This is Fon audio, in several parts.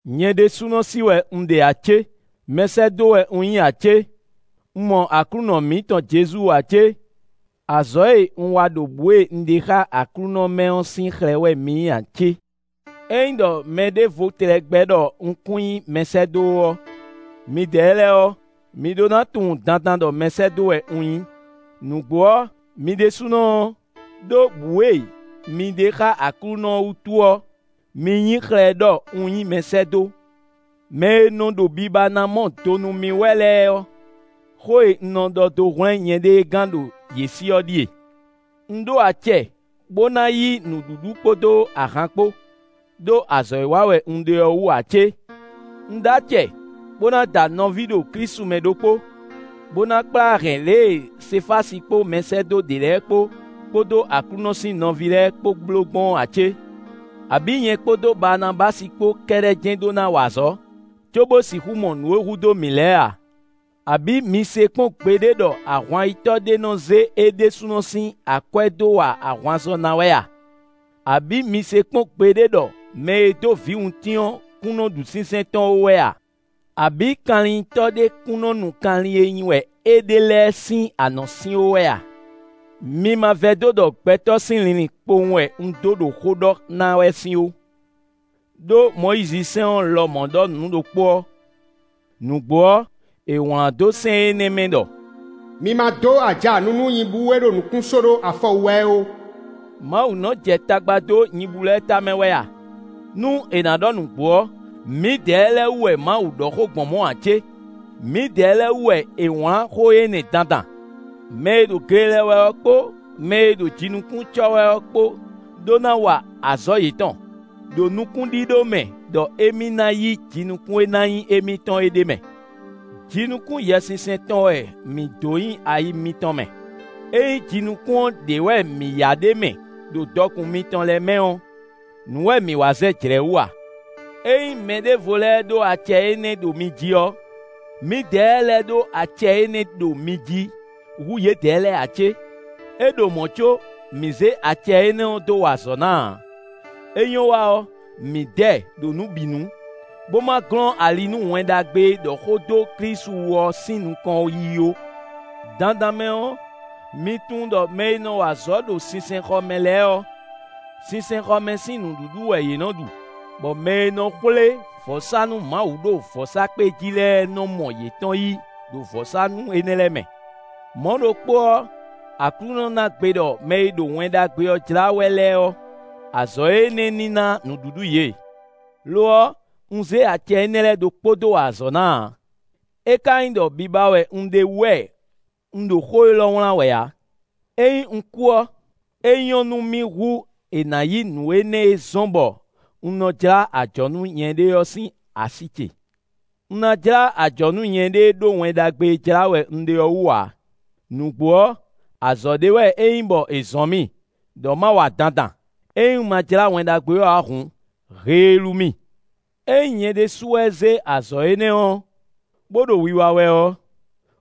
Nyɛ ɖésúnɔ sí wɛ un ɖe ǎ cé? Mɛsɛ́dó wɛ un nyí ǎ cé? Un mɔ Aklúnɔ mǐtɔn Jezu ǎ cé? Azɔ̌ e un wa ɖo bǔ e un ɖe xá Aklúnɔ mɛ ɔ́ sín xlɛ́ wɛ mi nyí ǎ cé? Ényí ɖɔ mɛɖěvo tlɛ gbɛ́ ɖɔ un kún nyí mɛsɛ́dó ó ɔ́, midɛɛ lɛ́ɛ ɔ́, mi ɖó ná tunwun dandan ɖɔ mɛsɛ́dó wɛ un nyí. Nǔgbó ɔ́, mi ɖésúnɔ ɔ́, ɖó bǔ e mi ɖe xá Aklúnɔ ɔ́ wútu ɔ́, mi nyí xlɛ́ ɖɔ un nyí mɛsɛ́dó. Mɛ e nɔ ɖo biba ná mɔ do nú mì wɛ lɛ́ɛ ɔ́, xó e un nɔ dó hwlɛ́n nyɛɖée gán ɖo yě sí ɔ́ ɖíe: un ɖó acɛ bó ná yí nǔɖuɖu kpódó ahan kpó, ɖó azɔ̌ e wa wɛ un ɖe ɔ́ wú ǎ cé? Un ɖó acɛ bó ná da nɔví ɖo Klísu mɛ ɖokpó, bó ná kplá hɛn lě e Sefási kpó mɛsɛ́dó ɖě lɛ́ɛ kpó, kpódó Aklúnɔ sín nɔví lɛ́ɛ kpó bló gbɔn ɔ́ a cé? Abǐ nyɛ kpódó Baanabási kpó kɛ́ɖɛ́ jɛ́n ɖó ná wa azɔ̌, cóbó sixú mɔ nǔ e hu dó mǐ lɛ́ɛ a? Abǐ mi se kpɔ́n gbeɖé ɖɔ ahwan-yitɔ́ ɖé nɔ zé é ɖésúnɔ sín akwɛ́ dó wa ahwanzɔ́ ná wɛ a? Abǐ mi se kpɔ́n gbeɖé ɖɔ mɛ e dó vǐwuntín ɔ́ kún nɔ ɖu sínsɛ́n tɔn ó wɛ a? Abǐ kanlinnyitɔ́ ɖé kún nɔ nu kanlin e nyi wɛ é ɖe lɛ́ɛ sín anɔ̌sin ó wɛ a? Mi ma vɛdó ɖɔ gbɛtɔ́ sín linlin kpowun wɛ un dó ɖo xó ɖɔ ná wɛ sín ó, ɖó Mɔyízisɛ́n ɔ́ lɔmɔ̌ ɖɔ nǔ ɖokpó ɔ́. Nǔgbó ɔ́, è wlán dó sɛ́n énɛ́ mɛ ɖɔ: “Mi ma dó aja nu nú nyibú e ɖo nǔkún só ɖó afɔ wú wɛ é ó.” Mawu nɔ jɛ tagba dó nyibú lɛ́ɛ tamɛ wɛ a? Nú è nǎ ɖɔ nǔgbó ɔ́, mǐdɛɛ lɛ́ɛ wú wɛ Mawu ɖɔ xó gbɔn mɔ̌ ǎ cé? Mǐdɛɛ lɛ́ɛ wú wɛ è wlǎn xó énɛ́ dandan. Mɛ e ɖo gle lɛ wɛ ɔ́ kpó mɛ e ɖo jinukún cɔ wɛ ɔ́ kpó ɖó ná wa azɔ̌ yětɔn, ɖo nukúnɖíɖó mɛ ɖɔ émí ná yí jinukún e ná nyí émítɔn ɔ́ ɖ'é mɛ. Jinukún Yɛsinsɛn tɔn wɛ mǐ dó nyi ayi mitɔn mɛ: ényí jinukún ɔ́ ɖě wɛ mǐ ya ɖ'é mɛ ɖo dɔkun mitɔn lɛ́ɛ mɛ ɔ́, nǔ wɛ mǐ wa zɛ jlɛ̌ wú a? Ényí mɛɖěvo lɛ́ɛ ɖó acɛ énɛ́ ɖo mi jí ɔ́, mǐdɛɛ lɛ́ɛ ɖó acɛ énɛ́ ɖo mi jí hú yědɛɛ lɛ́ɛ ǎ cé? É ɖo mɔ̌ có, mǐ zé acɛ énɛ́ ɔ́ dó wa azɔ̌ ná ǎ; é nyɔ́ wa ɔ́, mǐ dɛ ɖo nǔ bǐ nu, bó ma glɔ́n ali nú Wɛn Ɖagbe e ɖɔ xó dó Klísu wú ɔ́ sín nukɔn yiyi ó. Dandan mɛ ɔ́, mi tunwun ɖɔ mɛ e nɔ wa azɔ̌ ɖo sinsɛnxɔ mɛ lɛ́ɛ ɔ́, sinsɛnxɔ mɛ sín nǔɖuɖu wɛ yě nɔ́ ɖu; bɔ mɛ e nɔ xwlé vɔ̌sánú Mawu ɖo vɔ̌sákpe jí lɛ́ɛ nɔ mɔ yětɔn yí ɖo vɔ̌sánú énɛ́ lɛ́ɛ mɛ. Mɔ̌ ɖokpó ɔ́, Aklúnɔ ná gbe ɖɔ mɛ e ɖo Wɛn Ɖagbe ɔ́ jlá wɛ lɛ́ɛ ɔ́, azɔ̌ énɛ́ ní ná nǔɖuɖu yě. Lo ɔ́, un zé acɛ énɛ́ lɛ́ɛ ɖokpó dó wa azɔ̌ ná ǎ; é ka nyí ɖɔ biba wɛ un ɖe wú wɛ un ɖo xó élɔ́ wlán wɛ ǎ. Ényí un kú ɔ́, é nyɔ́ nú mì hú è nǎ yí nǔ énɛ́ e zɔ́n bɔ un nɔ jlá ajɔ̌ nú nyɛɖée ɔ́ sín así ce. Un ná jlá ajɔ̌ nú nyɛɖée ɖó Wɛn Ɖagbe e jlá wɛ un ɖe ɔ́ wú ǎ; nǔgbó ɔ́, azɔ̌ ɖé wɛ é nyí bɔ è zɔ̌n mì ɖɔ ma wa dandan; ényí un ma jlá Wɛn Ɖagbe ɔ́ ǎ hǔn, heelú mì. Ényí nyɛ ɖésú wɛ zé azɔ̌ énɛ́ ɔ́, bó ɖo wiwa wɛ ɔ́,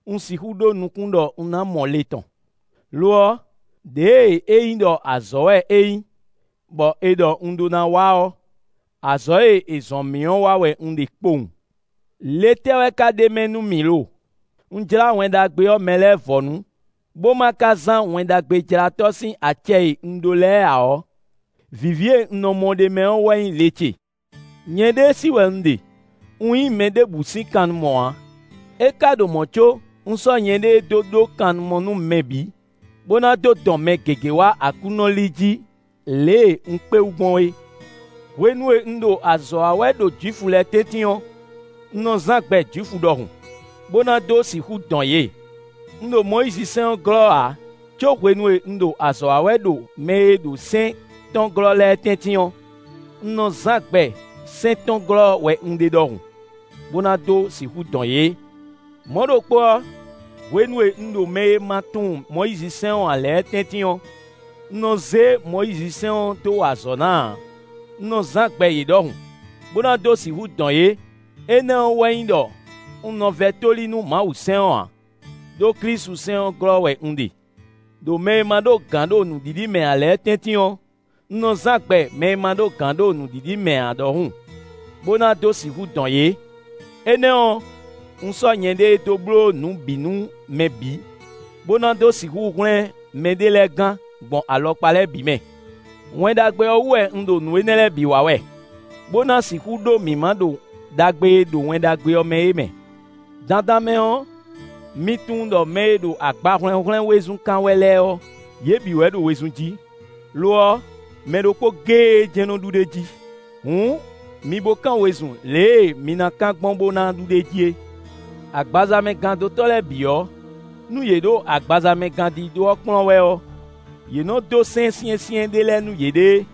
un sixú ɖó nukún ɖɔ un ná mɔ le tɔn. Lo ɔ́, ɖěe é nyí ɖɔ azɔ̌ wɛ é nyí, bɔ è ɖɔ un ɖó ná wa ɔ́, azɔ̌ e è zɔ́n mì ɔ́ wa wɛ un ɖe kpowun. Le tɛ́ wɛ ka ɖ'é mɛ nú mì lo? Nú un jlá Wɛn Ɖagbe ɔ́ mɛ lɛ́ɛ vɔ̌nu, bó ma ka zán Wɛn Ɖagbejlátɔ́ sín acɛ e un ɖó lɛ́ɛ ǎ ɔ́, vǐví e un nɔ mɔ ɖ'é mɛ ɔ́ wɛ nyí le ce. Nyɛɖée sí wɛ un ɖe; un nyí mɛ ɖěbǔ sín kannumɔ ǎ; é ka ɖo mɔ̌ có, un sɔ́ nyɛɖée dó ɖó kannumɔ nú mɛ bǐ, bó ná dó dɔn mɛ gěgé wá Aklúnɔ li jí lě e un kpé wú gbɔn é. Hwenu e un ɖo azɔ̌ wa wɛ ɖo Jwifu lɛ́ɛ tɛ́ntin ɔ́, un nɔ zán gbɛ Jwifu ɖɔhun, bó ná dó sixú dɔn yě; un ɖo Mɔyízisɛ́n ɔ́ glɔ́ ǎ, có hwenu e un ɖo azɔ̌ wa wɛ ɖo mɛ e ɖo sɛ́n tɔn glɔ́ lɛ́ɛ tɛ́ntin ɔ́, un nɔ zán gbɛ sɛ́n tɔn glɔ́ wɛ un ɖe ɖɔhun, bó ná dó sixú dɔn yě. Mɔ̌ ɖokpó ɔ́, hwenu e un ɖo mɛ e ma tunwun Mɔyízisɛ́n ɔ́ ǎ lɛ́ɛ tɛ́ntin ɔ́, un nɔ zé Mɔyízisɛ́n ɔ́ dó wa azɔ̌ ná ǎ; un nɔ zán gbɛ yě ɖɔhun, bó ná dó sixú dɔn yě; énɛ́ ɔ́ wɛ nyí ɖɔ un nɔ vɛ́ tóli nú Mawusɛ́n ɔ́ ǎ; ɖó klisusɛ́n ɔ́ glɔ́ wɛ un ɖe. Đo mɛ e ma ɖó gǎn ɖo nǔɖiɖi mɛ ǎ lɛ́ɛ tɛ́ntin ɔ́, un nɔ zán gbɛ mɛ e ma ɖó gǎn ɖo nǔɖiɖi mɛ ǎ ɖɔhun, bó na dó sixú dɔn yě. Énɛ́ ɔ́, un sɔ́ nyɛɖée dó bló nǔ bǐ nú mɛ bǐ, bó ná dó sixú hwlɛ́n mɛɖé lɛ́ɛ gán gbɔn alɔkpa lɛ́ɛ bǐ mɛ. Wɛn Ɖagbe ɔ́ wú wɛ un ɖo nǔ énɛ́ lɛ́ɛ bǐ wa wɛ, bó ná sixú ɖó mǐmá ɖo ɖagbe e ɖo Wɛn Ɖagbe ɔ́ mɛ é mɛ. Dandan mɛ ɔ́, mi tunwun ɖɔ mɛ e ɖo agbahwlɛ́nhwlɛ́n wezun kán wɛ lɛ́ɛ ɔ́, yě bǐ wɛ ɖo wezun jí; lo ɔ́, mɛ ɖokpó géé jɛ́n nɔ ɖu ɖ'é jí. Hǔn mi bo kán wezun lě e mi ná kán gbɔn bó ná ɖu ɖ'é jí é. Agbazamɛgándótɔ́ lɛ́ɛ bǐ ɔ́, nú yě ɖo agbazamɛgándídó ɔ́ kplɔ́n wɛ ɔ́, yě nɔ dó sɛ́n syɛ́nsyɛ́n ɖé lɛ́ɛ nú yěɖée;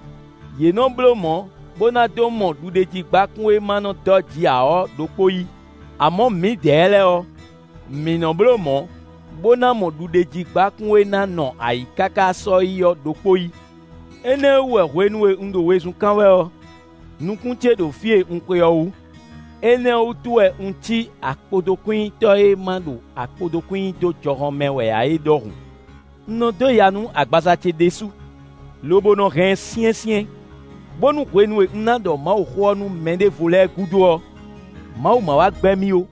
yě nɔ bló mɔ̌ bó ná dó mɔ ɖuɖéjígbákún e ma nɔ dɔ́ ji ǎ ɔ́ ɖokpó yí; amɔ̌ mǐdɛɛ lɛ́ɛ ɔ́, mǐ nɔ́ bló mɔ̌, bó ná mɔ ɖuɖéjígbákún e ná nɔ ayǐ káká sɔ́yi ɔ́ ɖokpó yí. Énɛ́ ɔ́ wú wɛ hwenu e un ɖo wezun kán wɛ ɔ́, nukún ce ɖo fí e un xwe ɔ́ wú; énɛ́ ɔ́ wútu wɛ un cí akpotokwínnyitɔ́ e ma ɖo akpotokwín nyi dó jɔhɔn mɛ wɛ ǎ é ɖɔhun. Un nɔ dó ya nú agbaza ce ɖésú, lobo nɔ hɛn ɛ syɛ́nsyɛ́n, bónú hwenu e un ná ɖɔ Mawuxó ɔ́ nú mɛɖěvo lɛ́ɛ gúdo ɔ́, Mawu ma wá gbɛ́ mì ó.